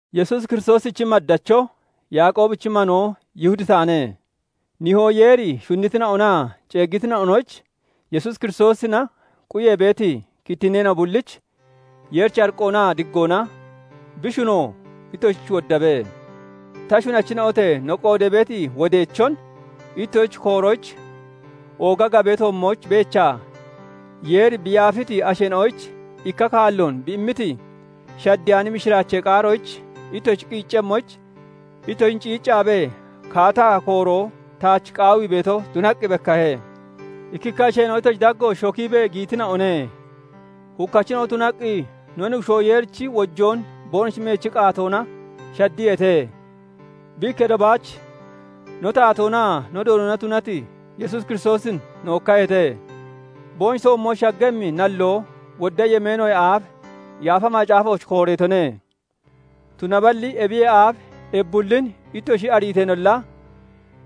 Yesuusi Kiristoosichi maddacho, Yaaqoobichi manoo Yihudi taane. Nihoo Yeeri shunnitina'onaa ceeggitina'onoyich, Yesuus Kiristoosina quyee beeti kittinneena'o bullich Yeerichi ariqqoonaa diggoona, bi shunoo ittoshich woddabe. Ta shunachina'ote! No qoodee beeti wodeechon ittoshich kooroyich oogati gabee toommooch beechaa, Yeeri bi yaafiti asheena'oyich ikka kaalloon bi immiti, shaddeyaani mishiraachee qaaroyich ittoshi qiiccemmoyich, ittoshin ciicciibee kaataa kooroo taach qaawii beeto tunaqqi bekkahe. Ikkikka asheena'o ittoshi daggooch shokiibee giyitina'one; hukkachina'o tunaqqi no Nuggushoo Yeerichi wojoon boonoshi meechi qaatoona shaddiyeete; bi ikketo baach no Taatoonaa no Doonona tunati Yesuus Kiristoosin nookkaheete; boonoshi toommooch shaggemmi nalloo wodda yemeenoyee aaf Yaafa Macaafooch kooreetone. Tunaballi ebiyee aaf ebi bullin ittoshi ariiteenolla,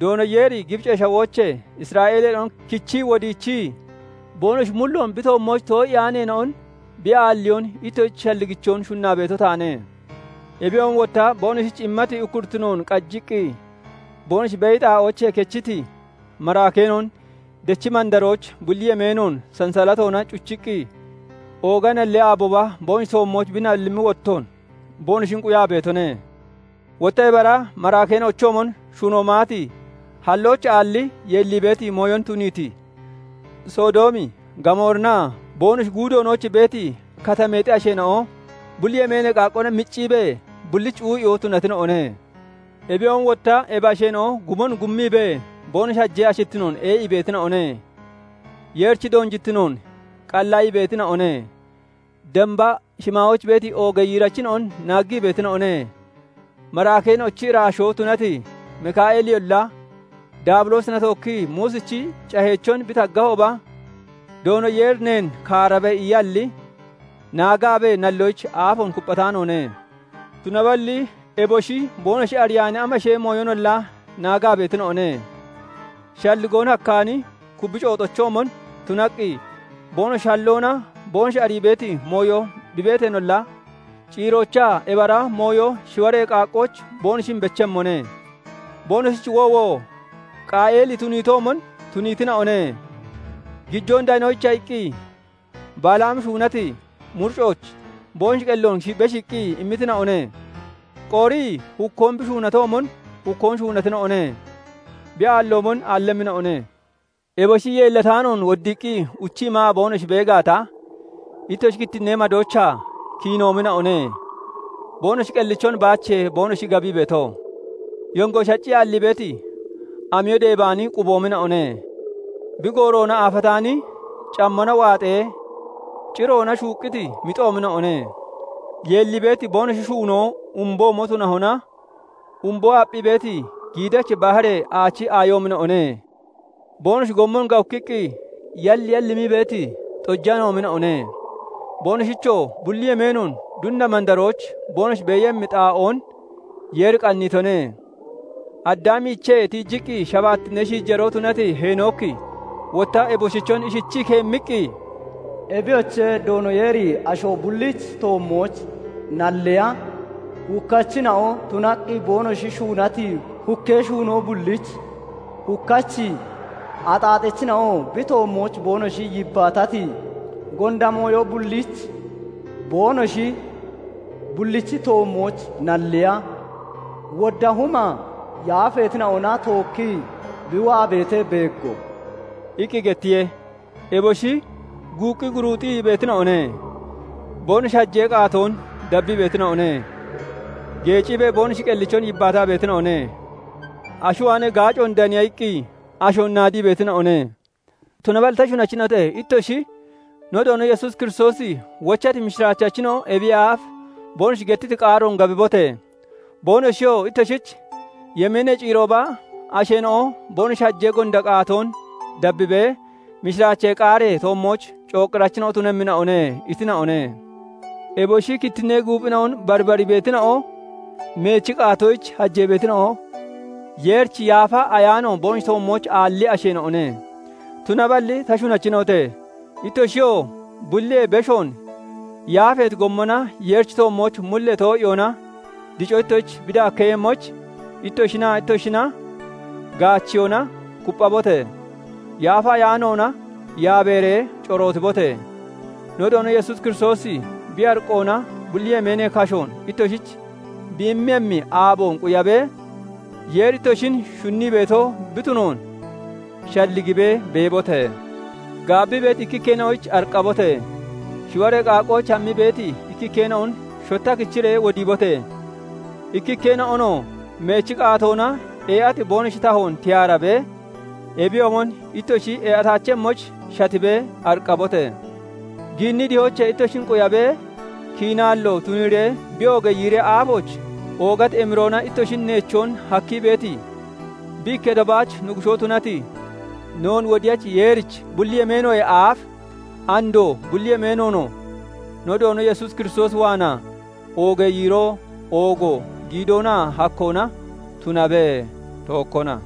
Doono Yeeri Gibicee Shawoochee Isra'eeleena'on kichii wodiichii, boonoshi mulloon bi toommooch too'iyaaneena'on bi aalliyoon ittoshich shalligichoon shunnaa beeto taane. Ebiyoomon wotta boonoshich immati ukkurittinoon qajiqqi boonoshi beeyi xaa'oochee kechiti maraakeena'on dechi mandarooch bulli yemeenoon sansalatoona cuchiqqi, ooga nallee aabooba boonoshi toommooch bi nallimmi wottoon boonoshin quyaa beetone. Wotta ebi ara maraakeena'ochoomon shuno maati, hallooch aalli yeellii beeti mooyon tuniiti, Sodoomi, Gamoorinaa boonoshi guudoonooch beeti katameexi asheena'o, bulli yemeenee qaaqqoona micciibee bullich cuu'iyoo tunatina'one. Ebiyoomon wotta ebi asheena'o gumon gummiibee boonoshi hajee ashittinoon ee'ii beetina'one; Yeerichi doonjittinoon qallaayii beetina'one; damba shimaayooch beeti oogee yiirachina'on naaggii beetina'one. Maraakeena'ochi iraashoo tunati Mika'eeliyolla Daabiloosina tookkii Muusichi caheechon bi taggahooba, "Doono Yeeri neen kaarabe" iyalli, naagaabee nalloyich aafoon kupphataanoone. Tunaballi eboshi boonoshi ariyaani amashee mooyonolla naagaa beetina'one; shalligoon hakkaani kubbi cooxochoomon tunaqqi boonoshi halloona boonoshi arii beeti mooyo bi beeteenolla, ciiroochaa ebi ara mooyo shiwaree qaaqqooch boonoshin bechemmone. Boonoshich woowo! Qaayeeli tuniitoomon tuniitina'one; gijoon danoyicha iqqi Balaami shuunati muricooch boonoshi qelloon beshiiqqi immitina'one; Qooriyi hukkoon bi shuunoomon hukkoon shuunatina'one; bi aalloomon aallemmina'one. Eboshi yeellataanoon woddiiqqi uchii maa boonoshi bee gaata, ittoshi ikkittinee madoochaa kiinoomina'one; boonoshi qellichon baachiye boonoshi gabii beeto; yongo shaccii aallii beeti, amiyo deebaani quboomina'one; bi gooroona aafataani, cammona waaxee ciroona shuuqqiti mixoomina'one; yeellii beeti boonoshi shuunoo umboomo tunahona, umboon aapphii beeti giidachi baharee aachi aayoomina'one; boonoshi gommon gawukkiqqi yalyallimii beeti xojaneena'oomina'one; boonoshichoo bulli yemeenoon dunna mandarooch boonoshi beeyemmi xaa'oon Yeeri qanniitone. Addaamiichee tiijiqqi shabaattinnee shiijaroo tunati Heenooki wotta eboshichon ishichii keemmiqqi, "Ebiyoche! Doono Yeeri asho bullichi toommooch nalliya, hukkachina'o tunaqqi boonoshi shuunati hukkee shuunoo bullich, hukkachi axaaxachina'oo bi toommooch boonoshi yibbaatati gonda mooyo bullich boonoshi bullichi toommooch nalliya, wodda huma yaafeetina'ona tookkii bi waa beetee beego" iqqi gettiye. Eboshi guuqqii guruuxii beetina'one; boonoshi hajee qaatoon dabbii beetina'one; geeciibee boonoshi qellichon yibbaataa beetina'one; ashi waanee gaacoon daniya iqqi ashoon naadii beetina'one. Tunaballi ta shunachina'ote! Ittoshi no Doono Yesuus Kiristoosi wochati mishiraachachina'o ebiyee aaf boonoshi gettiti qaaroon gabibote! Boonoshiyoo ittoshich "Yemeenee ciirooba asheena'o boonoshi hajee gonda qaatoon dabbibee mishiraachee qaaree toommooch cooqqirachina'o tunemmina'one" itina'one. Eboshi kittinnee guuphina'on barbarii beetina'o, meechi qaatoyich hajee beetina'o, Yeerichi Yaafa Ayaano boonoshi toommooch aalli asheena'one. Tunaballi ta shunachina'ote! Ittoshiyoo bulliyee beshoon yaafeeti gommona Yeerichi toommooch mullee too'iyoona dico ittoshich bi daakkeeyemmoyich, ittoshinaa itooshina gaacheyoona kupphabote! Yaafa Ayaanoona yaabeeree corootibote! No Doono Yesuus Kiristoosi bi ariqqoona bulli yemeenee kashoon ittoshich bi immemmi aaboon quyabee, Yeeri ittoshin shunnii beeto bi tunoon shalligibee beebote! Gaabbii beeti ikkikkeena'oyich ariqqabote! Shiwaree qaaqqooch hammii beeti ikkikkeena'on shotta kichiree wodiibote! Ikkikkeena'onoo meechi qaatoona ee'ati boonoshi tahoon tiyaarabee, ebiyoomon ittoshi ee'ataachemmoyich shatibee ariqqabote! Giinnii dihoochee ittoshin quyabee, kiinaallo tuniiree bi oogee yiiree aafooch oogati emiroona ittoshin neechoon hakkii beeti, bi ikketo baach Nuggushoo tunati, noon Wodiyachi Yeerich, bulli yemeenoyee aaf, andoo, bulli yemeenoonoo no Doono Yesuus Kiristoos waanaa oogee yiiroo, oogo, giidoonaa hakkoona tunabe; tookkona.